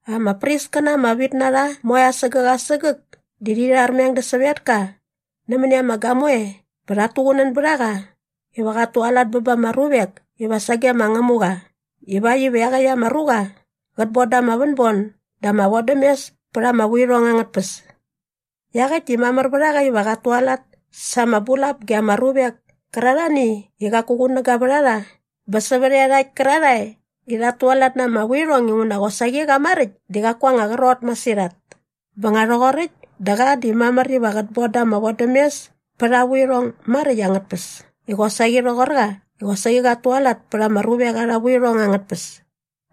Ama priskäna ama vit na rha moe asägäk asägäk di rhi rharmeng dä sävetka nämäni ama gamoe bä rhat tuqunän bät a qa iva qat tualat bä ba ama ruvek iva sage ma Ngämuqa ivakt iva iaqäkt ama ruqa qät bon da ama vänbon dä ama vodämes pät ama vuirhong angät tpäs. Iaqäkt di mamär vät a qa iva qat tualat sa ama bulap ge ama ruvek kärarhani i qaku qunäga vät a rha bä sävät iarhakt kärarhae i rhat tualat na ama vuirhong inguna qosaqi qa maräkt di qaku aa anga qrot masirhat. Bä nga rhoqoräkt dä qa di mamär iva qät bon da ama vodämes pät aa vuirhong maräkt angät tpäs di qosaqi rhoqor qa i qosaqi qat tualat pät ama ruvek arha vuirhong angät tpäs.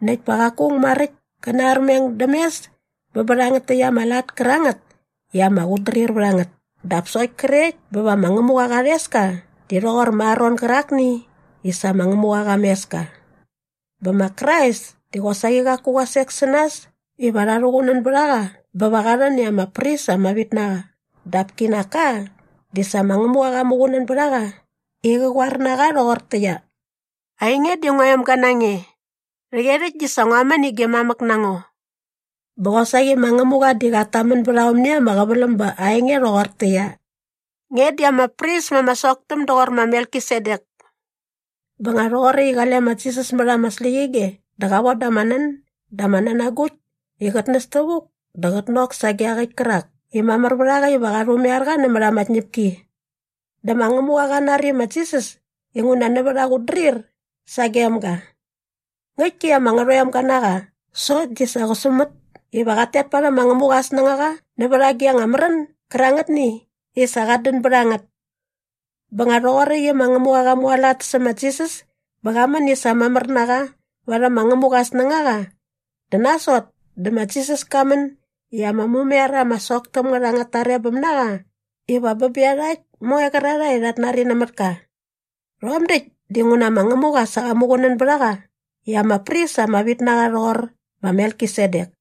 Näkt pa qaku aung maräkt kä narmeng däm mes bä bä rhangät täkt ama lat kärangät i ama qutdrir vät a ngät dap sokt krekt bä va ma Ngämuqa qa rhes ka di rhoqor ma Aron gärakni i sa ma Ngämuqa qa mes ka. Bä ma Krais di qosaqi qaku qa sek sä nas iva rha rhuqunän bät a qa bä va qa rhän i ama pris ama vit na qa dap kinak ka di sa ma Ngämuqa qa muqunän bät a qa i qä qoar na qa rhoqortäqyia, “Ainge di ngua emga na nge. Rhäqyerhäkt di sa ngua män i gi mamäk na ngo.” Bä qosaqi ma Ngämuqa di qat tamän bät aomni ama qäväläm ba aa enge rhoqortäqyia, “Nge di ama pris ma ama soktäm doqor ma Melkisedek.” Bä nga rhoqoräkt i qale ma Jisas mät ama släqyige dä qa von da ama nän dä ama nänagukt i qät näs tävuk dä qät nok sage iaqäkt kärak i mamär vät a qa iva qa rhumaiar qa nämät ama tñäpki. Dä ma Ngämuqa qa nari ma Jisas inguna nävät aa qutdrir sagem ga. Ngäktki i ama ngärhoemga na qa sokt di sa qä sumät iva qat tet parhäm ma Ngämuqa aa snängaqa nävät agi anga märän gärangätni i sa qat dän bät a ngät. Bä nga rhoqoräkt i ma Ngämuqa qa mualat sä ma Jisas bä qa män i sa mamär na qa varhäm ma Ngämuqa aa snängaqa dä nasot dä ma Jisas ka män i ama mumaiar ama sok täm ngät angät tarebäm na qa iva bä bä iarhakt moe qärarhae i rhat nari nämät ka. Rhom däkt dinguna ma Ngämuqa sa qa muqunän bät a qa i ama pris ama vit na qa rhoqor ma Melkisedek.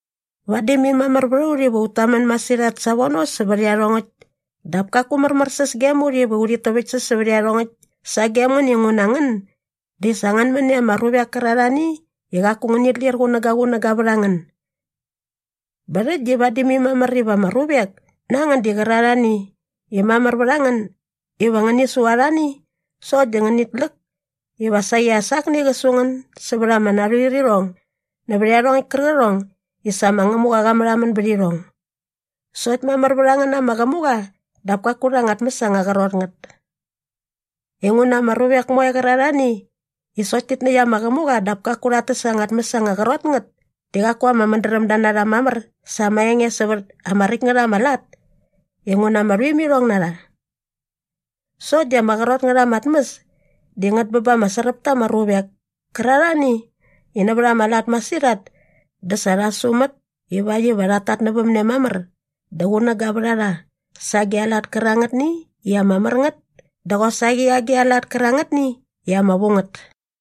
Vadi mai mamär vät a ut iva ut tamän masirhat savono sävät iarhongäkt dap kaku märmärsäs gem ut iva urhit täväktsäs sävät iarhongäkt sagem ngän inguna ngän di sa ngän män i ama ruvek kärarhani i qaku ngänit lir qunägaqunäga vät a ngän. Bä rhäkt di vadi mai mamär iva ama ruvek na ngän gärarhani i mamär vät a ngän iva ngäni su arhani sokt di ngänit läk iva saqi as akni qä su ngän sävät ama narhuirirhong nävät iarhongäkt kärqärhong i sa ma Ngämuqa qa märhamän bät irhong. Sokt mamär vät a ngän na ama qämuqa dap kaku rha anga tmäs anga qrot ngät. Inguna ama ruvek moe qärarhani i sokt tit näkt ama qämuqa dap kaku rhat täs anga tmäs anga qrot ngät di qaku ama mädrämda na rha mamär sa ama enge sävät ama räkt ngät ama lat inguna ama rhuimirhong na rha. Sokt di ama qrot ngät ama tmäs di ngät bä ba ama sräp ta ama ruvek kärarhani i nävät ama lat masirhat dä sa rha sumät ivakt iva rhat tatnävämne mamär dä qunäga vät a rha sa agi a lat kärangätni i ama mär ngät dä qosaqi agi a lat kärangätni i ama vu ngät.